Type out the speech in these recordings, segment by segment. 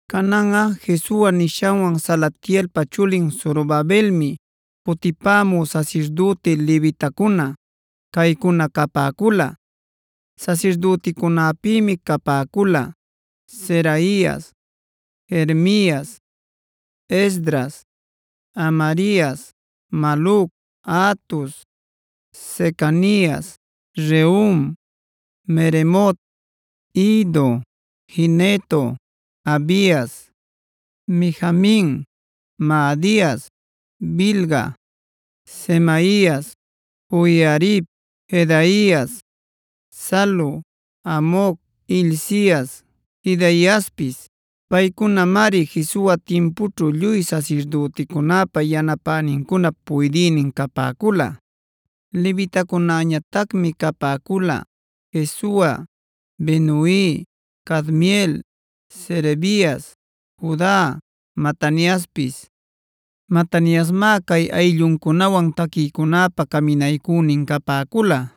Cananꞌa Jesua nishanwan Salatielpa chulin Zorobabelmi cutipämü sasirdüti levitacuna caycuna capäcula. Sasirdüticunäpïmi capäcula: Seraias, Jeremias, Esdras, Amarias, Maluc, Hatus, Secanias, Rehum, Meremot, Iddo, Gineto, Abias, Mijamin, Maadias, Bilga, Semaias, Joiarib, Jedaias, Salu, Amoc, Hilcias, Jedaiaspis. Paycunamari Jesua timpućhu lluy sasirdüticunäpa yanapänincunap puydïnin capäcula. Levitacunäñatacmi capäcula: Jesua, Binui, Cadmiel, Serebias, Juda, Mataniaspis. Mataniasmá cay aylluncunawan taquïcunäpa caminaycünin capäcula.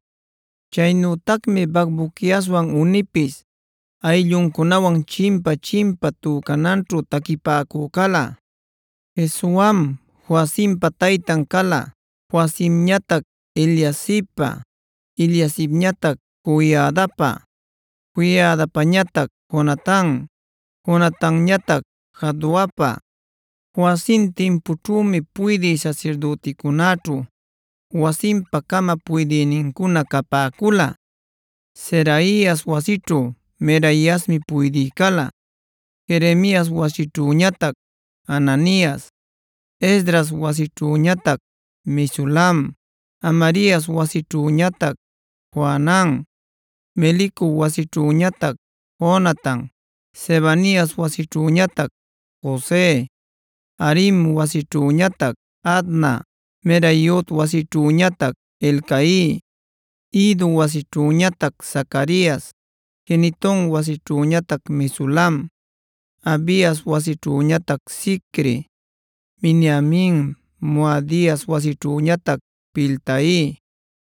Chaynütacmi Bacbuquiaswan Unipis aylluncunawan chimpa-chimpa tücananćhu taquipäcü cala. Jesuam Joiacimpa taytan cala, Joiacimñatac Eliasibpa, Eliasibñatac Joiadapa, Joiadapañatac Jonatan, Jonatanñatac Jaduapa. Joiacim timpućhümi puydï sasirdüticunäćhu wasinpa-cama puydïnincuna capäcula: Seraias wasićhu Meraiasmi puydï cala, Jeremias wasićhüñatac Hananias, Esdras wasićhüñatac Mesulam, Amarias wasićhüñatac Johanan, Melicu wasićhüñatac Jonatan, Sebanias wasićhüñatac Jose, Harim wasićhüñatac Adna, Meraiot wasićhüñatac Helcai, Iddo wasićhüñatac Zacarias, Gineton wasićhüñatac Mesulam, Abias wasićhüñatac Zicri, Miniamin, Moadias wasićhüñatac Piltai,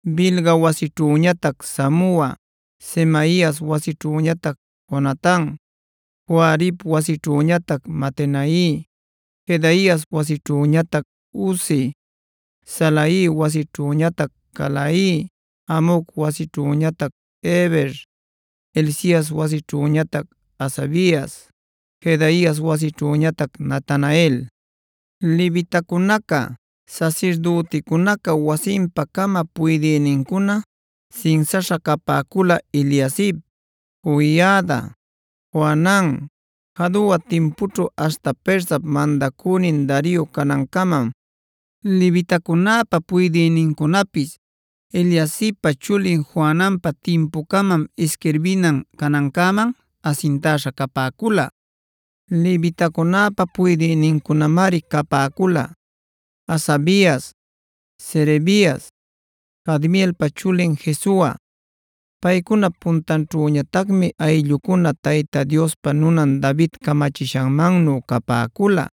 Bilga wasićhüñatac Samua, Semaias wasićhüñatac Jonatan, Joiarib wasićhüñatac Matenai, Jedaias wasićhüñatac Uzi, Salai wasićhüñatac Calai, Amoc wasićhüñatac Eber, Hilcias wasićhüñatac Hasabias, Jedaias wasićhüñatac Natanael. Levitacunaca, sasirdüticunaca wasinpa-cama puydïnincuna sinsaśha capäcula Eliasib, Joiada, Johanan, Jadua timpućhu aśhta Persap mandacünin Dario canancamam. Levitacunäpa puydïnincunapis Eliasibpa chulin Johananpa timpucamam isquirbinan canancäman asintäśha capäcula. Levitacunäpa puydïnincunamari capäcula: Hasabias, Serebias, Cadmielpa chulin Jesua. Paycunap puntanćhüñatacmi aylluncuna Tayta Diospa nunan David camachishanmannu capäcula.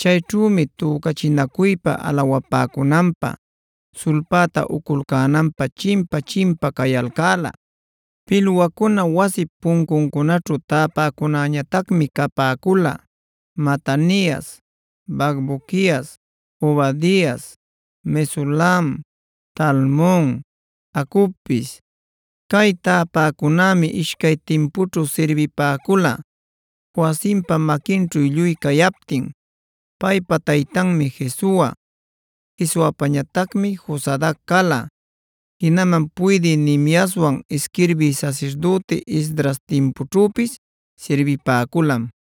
Chayćhümi tücachinacuypa alawapäcunanpä, sulpäta uculcänanpä chimpa-chimpa cayalcäla. Pilwacuna wasip puncuncunaćhu täpäcunäñatacmi capäcula: Matanias, Bacbuquias, Obadias, Mesulam, Talmon, Acubpis. Cay täpäcunämi ishcay timpućhu sirbipäcula Joiacimpa maquinćhu lluy cayaptin. Paypa taytanmi Jesua, Jesuapañatacmi Josadac cala. Jinaman puydï Nehemiaswan isquirbï sasirdüti Esdras timpućhüpis sirbipäculam.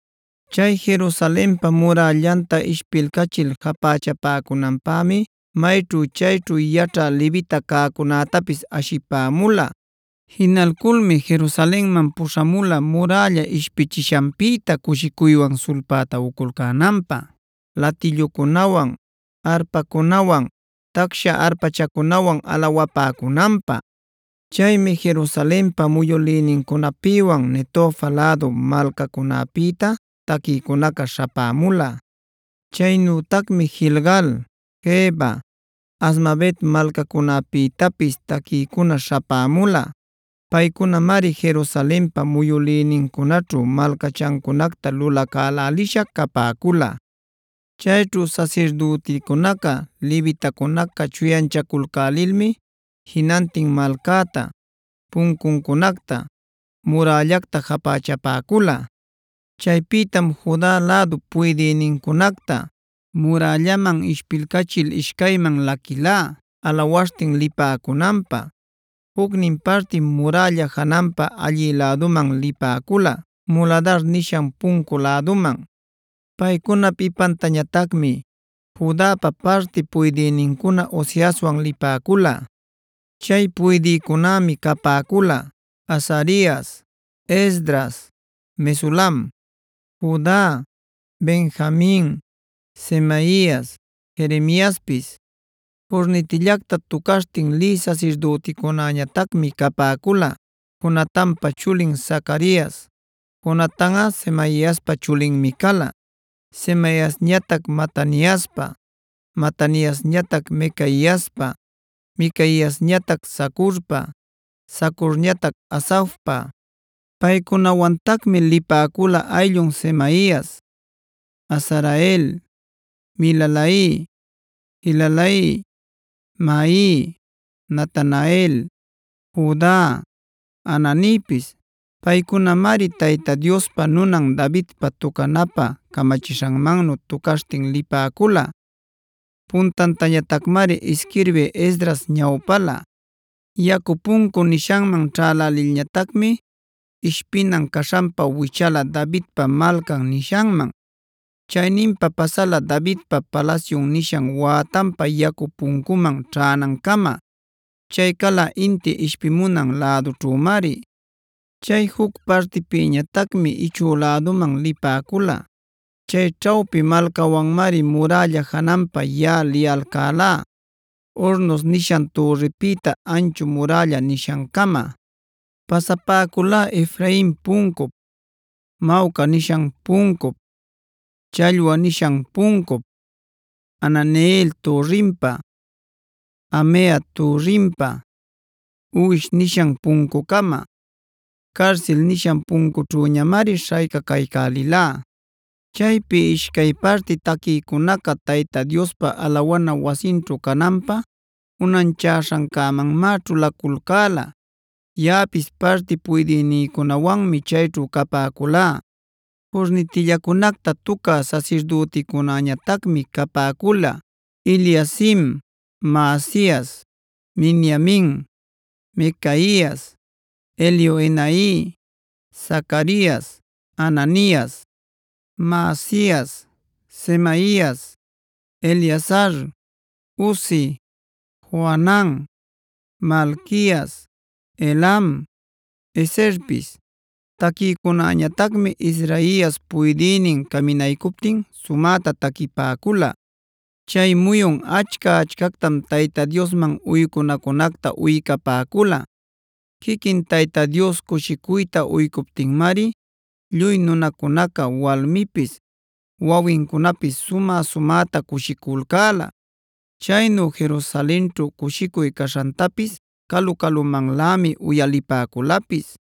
Chay Jerusalenpa murällanta ishpilcachil japächapäcunanpämi mayćhu chayćhu yaćhä levita cäcunätapis ashipämula. Jinalculmi Jerusalenman puśhamula murälla ishpichishanpïta cushicuywan sulpäta uculcänanpä, latillucunawan, arpacunawan, tacsha arpachacunawan alawapäcunanpä. Chaymi Jerusalenpa muyülïnincunapïwan Netofa lädup malcacunäpïta taquïcunaca śhapämula. Chaynütacmi Gilgal, Geba, Azmavet malcacunäpïtapis taquïcuna śhapämula. Paycunamari Jerusalenpa muyülïnincunaćhu malcachancunacta lulacälälisha capäcula. Chayćhu sasirdüticunaca levitacunaca chuyanchaculcälilmi jinantin malcäta, puncuncunacta, murällacta japächapäcula. Chaypïtam Juda lädup puydïnincunacta murällaman ishpilcachil ishcayman laquïlá alawaśhtin lipäcunanpä. Jucnin partim murälla jananpa allï läduman lipäcula, Muladar nishan puncu läduman. Paycunap ipantañatacmi Judapa parti puydïnincuna Osaiaswan lipäcula. Chay puydïcunämi capäcula: Azarias, Esdras, Mesulam, Juda, Benjamin, Semaias, Jeremiaspis. Curnitillacta tucaśhtin lï sasirdüticunäñatacmi capäcula: Jonatanpa chulin Zacarias; Jonatanꞌa Semaiaspa chulinmi cala, Semaiasñatac Mataniaspa, Mataniasñatac Micaiaspa, Micaiasñatac Zacurpa, Zacurñatac Asafpa. Paycunawantacmi lipäcula ayllun Semaias, Azarael, Milalai, Gilalai, Maai, Natanael, Juda, Hananipis. Paycunamari Tayta Diospa nunan Davidpa tucanapä camachishanmannu tucaśhtin lipäcula. Puntantañatacmari isquirbï Esdras ñawpala. Yacu Puncu nishanman ćhalälilñatacmi ishpinan caśhanpa wichala Davidpa Malcan nishanman. Chayninpa pasala Davidpa palasyun nishan wätanpa Yacu Puncuman ćhänancama. Chay cala inti ishpimunan lädućhümari. Chay juc partiñatacmi ichü läduman lipäcula. Chay ćhawpi malcawanmari murälla jananpa yaꞌa liyalcälá Hornos nishan türripïta Anchu Murälla nishancama. Pasapäculá Efrain puncup, Mawca nishan puncup, Challwa nishan puncup, Hananeel türrinpa, Hamea türrinpa, Uwish nishan puncucama. Carsil nishan puncućhüñamari śhaycacaycälilá. Chaypi ishcay parti taquïcunaca Tayta Diospa alawana wasinćhu cananpä unanchaśhancämanmá ćhulaculcäla. Yaꞌapis parti puydïcunäwanmi chayćhu capäculá. Curnitillacunacta tucä sasirdüticunäñatacmi capäcula: Eliacim, Maasias, Miniamin, Micaias, Elioenai, Zacarias, Hananias, Maasias, Semaias, Eleazar, Uzi, Johanan, Malquias, Elam, Ezerpis. Taquïcunäñatacmi Izrahias puydïnin caminaycuptin sumäta taquipäcula. Chay muyun achca-achcactam Tayta Diosman uycunacunacta uycapäcula.a Quiquin Tayta Dios cushicuyta uycuptinmari lluy nunacunaca walmipis, wawincunapis sumä-sumäta cushiculcäla. Chaynu Jerusalenćhu cushicuy caśhantapis calu-calumanlämi uyalipäculapis.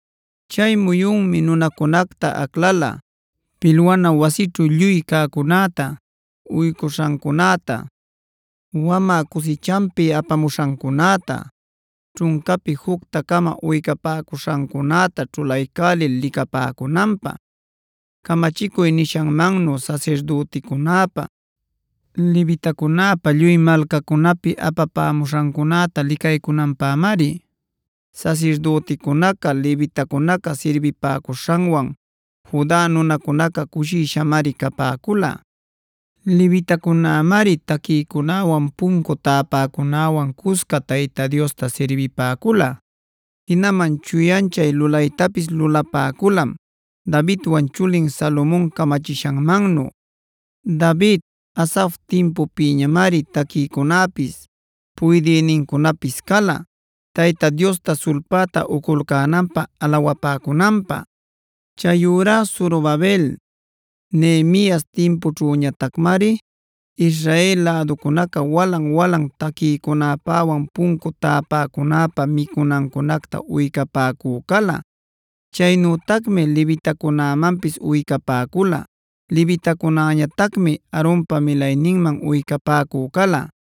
Chay muyunmi nunacunacta aclala pilwana wasićhu lluy cäcunäta, uycuśhancunäta, wamä cusichanpi apamuśhancunäta, ćhuncapi jucta-cama uycapäcuśhancunäta ćhulaycälil licapäcunanpä; camachicuy nishanmannu sasirdüticunäpa, levitacunäpa lluy malcacunapi apapämuśhancunäta licaycunanpämari. Sasirdüticunaca levitacunaca sirbipäcuśhanwan Juda nunacunaca cushishamari capäcula. Levitacunämari taquïcunäwanb puncu täpäcunäwanc cusca Tayta Diosta sirbipäcula; jinaman chuyanchay lulaytapis lulapäculam Davidwan chulin Salomon camachishanmannu. David, Asaf timpupïñamari taquïcunapis, puydïnincunapis cala Tayta Diosta sulpäta uculcänanpä alawapäcunanpä. Chayurá Zorobabel, Nehemias timpućhüñatacmari Israel läducunaca walan-walan taquïcunäpäwan puncu tapäcunäpä micunancunacta uycapäcü cala. Chaynütacmi levitacunämanpis uycapäcula. Levitacunäñatacmi Aaronpa milayninman uycapäcü cala.